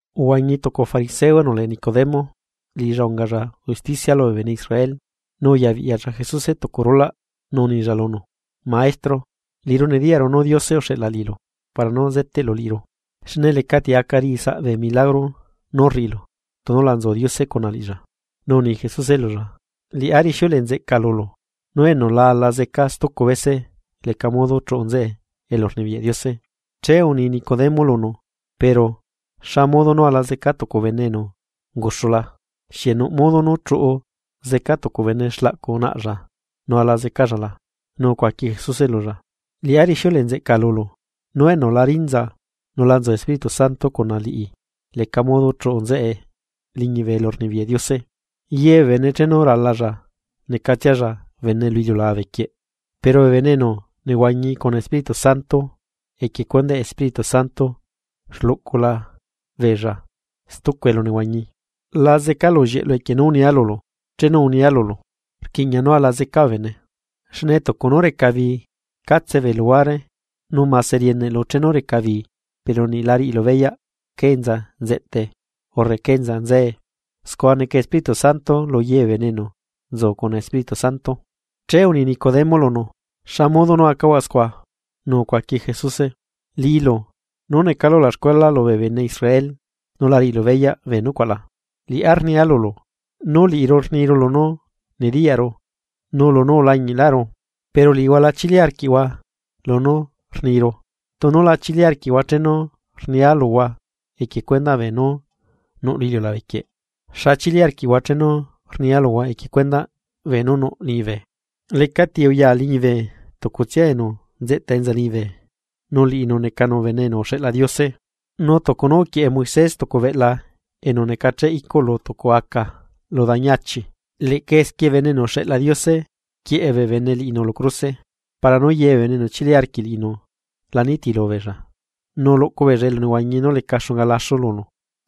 Uhuañi tucu fariseo enu lee Nicodemo, liꞌilla ungalla usticia lubee bene Israel. Nu uyabiꞌyalla Jesuse tucu rulaꞌ, nu unilla lunu: ―Maestro, liꞌiru nediyaꞌru nú Diose uxeꞌla liꞌilu para nú zeteꞌlu liꞌiru, xne lecati aca riꞌi saꞌ bee milagro nú rriꞌilu tunu la nzu Diose cuna liꞌilla. Nu uni Jesuse lulla: ―Liꞌá rixiuleꞌe nzeꞌca lulu, nú enu la ala zeca stucu bese leca modo chuꞌu nzeꞌe elurnibiyaꞌ Diose. Che uni Nicodemo lunu: ―Pero ¿xa modo nú ala zeca tucu bene enu unguxula? ¿Xieꞌ nuꞌ modo nú chuꞌu zeca tucu bene xlaꞌcu naꞌlla nu ala zecalla la? Nu ucuaqui Jesuse lulla: ―Liꞌá rixiuleꞌe nzeꞌca lulu, nú enu la rinza nu la nzu Espíritu Santo cuna liꞌi leca modo chuꞌu nzeꞌe liñibe elurnibiyaꞌ Diose. Ye bee bene chenu ralalla, necatsialla bene lu iliulabe quieꞌ. Pero bee bene enu nehuañi cuna Espíritu Santo, equie cuendaꞌ Espíritu Santo rluꞌcula beella stucu elunehuañi. La zeca lullieꞌlu equie nú unia lulu chenu unia lulu: “Rquiꞌña nú ala zeca bee bene.” Xne tucu nú reca bii catse bee luhuare, nu mase rieneꞌlu chenu reca bii, pero niꞌla riꞌilu beyaꞌ cá enza nzeꞌtae, urre cá enza nzae. Scua neca Espíritu Santo luye bee bene enu nzu cuna Espíritu Santo. Che uni Nicodemo lunu: ―¿Xa modo nú acahuaꞌ scua? Nu ucuaqui Jesuse: ―¿Liꞌilu, nú necalu ulaxcuela lubee bene Israel, nu la riꞌilu beyaꞌ bee nucuaꞌ la? Liꞌá rnia lulu, nú liꞌiru rniru lunú nediyaꞌru nu lunú ulañiꞌlaꞌru. Pero liꞌihua la chili arquiꞌhua lunú rniru. Tunu la chili arquiꞌhua chenu rnia luhua equie cuendaꞌ beenú nuꞌ lu iliulabe quieꞌ. ¿Xa chili arquiꞌhua chenu rnia luhua equie cuendaꞌ beenú nuꞌ liñibe? ’Lecali ti uya liñibe tucutsia enu nzeꞌta enza liñibe, nu liꞌinu necanu Bene enu uxeꞌla Diose. Nu tucu nú uquieꞌe Moisés tucu beꞌla enu necacheꞌ icuꞌ lu tucu aca lu dañi achi, leꞌca esquie Bene enu uxeꞌla Diose quieꞌe bee bene liꞌinu lu cruse, para nú ye bee bene enu chili arquiꞌ liꞌinu, la nitilu beella, nu luꞌcu beella elunehuañi nú leca xunga laxu lunu.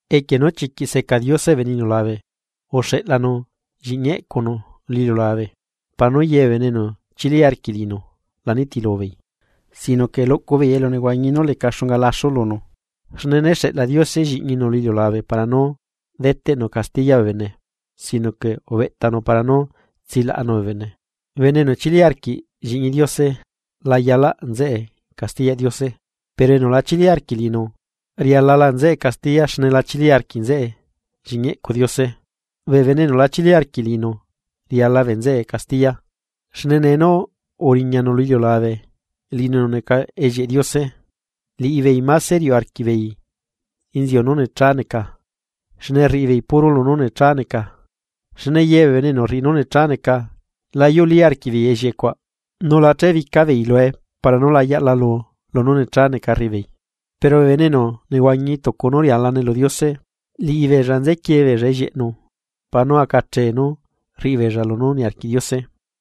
’Equie nú chiquiꞌ seca Diose bee bene iliulabe, uxeꞌlanu Lliꞌñi eꞌcunu lu iliulabe para nú ye bee bene enu chili arquiꞌ liꞌinu la nitilubeei, sino que luꞌcu beei elunehuañi nú leca xunga laxu lunu. Xne né xeꞌla Diose Lliꞌñinu lu iliulabe para nú deteꞌnu castiya bee bene, sino que ubeꞌtanu para nú tsilaꞌanu bee bene. ’Bene enu chili arquiꞌ Lliꞌñi Diose, la zecaꞌ nzeꞌe castiyaꞌ Diose. Pero enu la chilí arquiꞌ liꞌinu, zeca nzeꞌe castiya xne la chili arquiꞌ nzeꞌe Lliꞌñi eꞌcu Diose. Bee bene enu la chili arquiꞌ liꞌinu zeca bee nzeꞌe castiya, xne nee nú uriñanu lu iliulabe liꞌinu enu neca ellieꞌ Diose, liꞌibeei máse riuꞌ arquiꞌbeei inziu nú necha neca, xne rriꞌi beei puro lunú necha neca. Xne ye bee enu rriꞌi nú necha neca, la yuꞌlí arquiꞌbeei ellieꞌe cuaꞌ, nu la chebica beei lue para nú la yaꞌlalu lunú necha neca rriꞌibeei. pero bee bene enu nehuañi tucu nú rialane lu Diose, liꞌibeella nzequie beella ellieꞌnu para nú acachee nú rriꞌi beella lunú niarquiꞌ Diose.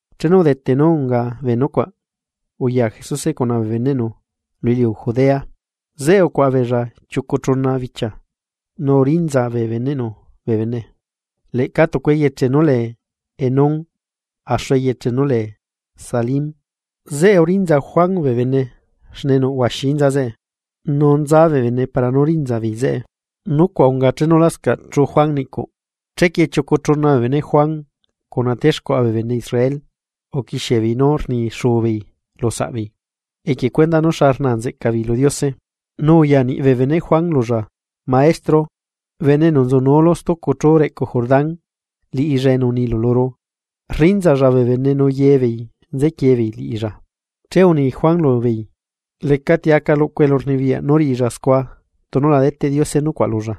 Chenu udete nú unga bee nucuaꞌ, uya Jesuse cuna bee beneꞌnu lu iliu Judea, zeꞌe ucuaꞌa beella chiucu chuna bichia nu urinza bee beneꞌnu bee bene. Leꞌca tucu eyeche nú lee Enón, axu eyeche nú lee Salim, zeꞌe uriꞌnza Juan bee bene xne nuꞌ huaxi inza zeꞌe, nu nza bee bene para nú rinza beei zeꞌe. Nucuaꞌ unga chenu lascaꞌ chuꞌu Juan niꞌcuꞌ. Chequie chiucu chuna bee beneꞌ Juan cuna texcuaꞌa bee bene Israel, uquixie beei nú rni xuu beei lu saꞌbeei equie cuendaꞌ nú xa rnaa nzeꞌca beei lu Diose. Nu uya niꞌ bee beneꞌ Juan lulla: ―Maestro, bene enu nzunuulu stucu chú reꞌcu Jordán, liꞌilla enu unilu luru, rrinzalla bee bene nu ye beei nzequie beei liꞌilla. Che uni Juan lubeei: ―Lecati aca luꞌcu elurnibiyaꞌ nú riꞌilla scua tunu la deteꞌ Diose nucuaꞌ lulla.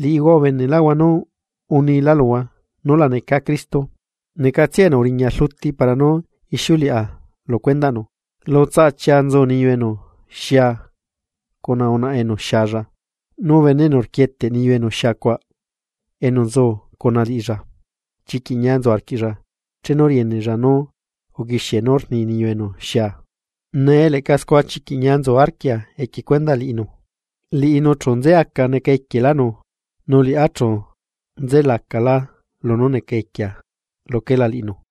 Liꞌihua ubenelaꞌhua nú unila luhua nú la neca Cristo, necatsia enu uriña rluti para nú ixiuleꞌa lu cuendaꞌnu. Lu tsaꞌa chia nzu niyu enu xia cuna unaꞌa enu xialla, nu bene enu rquieteꞌ niyu enu xiacuaꞌ enu nzu cuna liꞌilla, chiquiꞌ ñia nzu arquiꞌlla chenu rieneꞌlla nú uquixie nú rni niyu enu xia. Nee leꞌca scua chiquiꞌ ñia nzu arquia equie cuendaꞌ liꞌinu. Liꞌinu chu nzeaca neca equielánu, nu liꞌá chu nzelacalá lunú neca equia luquela liꞌinu.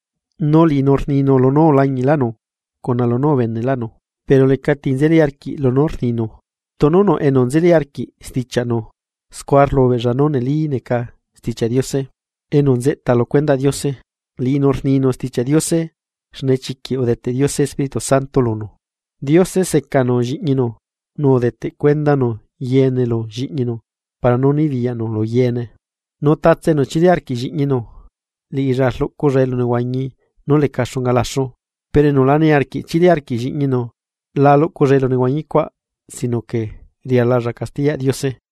Nu liꞌinu rninu lunú ulañiꞌlaꞌnu cuna lunú ubeneꞌlaꞌnu. Pero lecati nzeli arquiꞌ lunú rninu. Tunu nuꞌ enu nzeli arquiꞌ stichiaꞌnu, scua rlubeꞌlla nú neli neca Stichiaꞌ Diose. Enu nzeꞌta lu cuendaꞌ Diose, liꞌinu rninu Stichiaꞌ Diose xne chiquiꞌ udeteꞌ Diose Espíritu Santo lunú. Diose secanu Lliꞌñinu, nu udeteꞌ cuendanu yeene lu Lliꞌñinu para nú nibiyaꞌnu lu yeene. Nu tatse enu chili arquiꞌ Lliꞌñinu, liꞌilla rluꞌculla elunehuañi nú leca xunga laxu, pero enu la niarquiꞌ chili arquiꞌ Lliꞌñinu la luꞌculla elunehuañi cuaꞌ sino que rialalla castiyaꞌ Diose.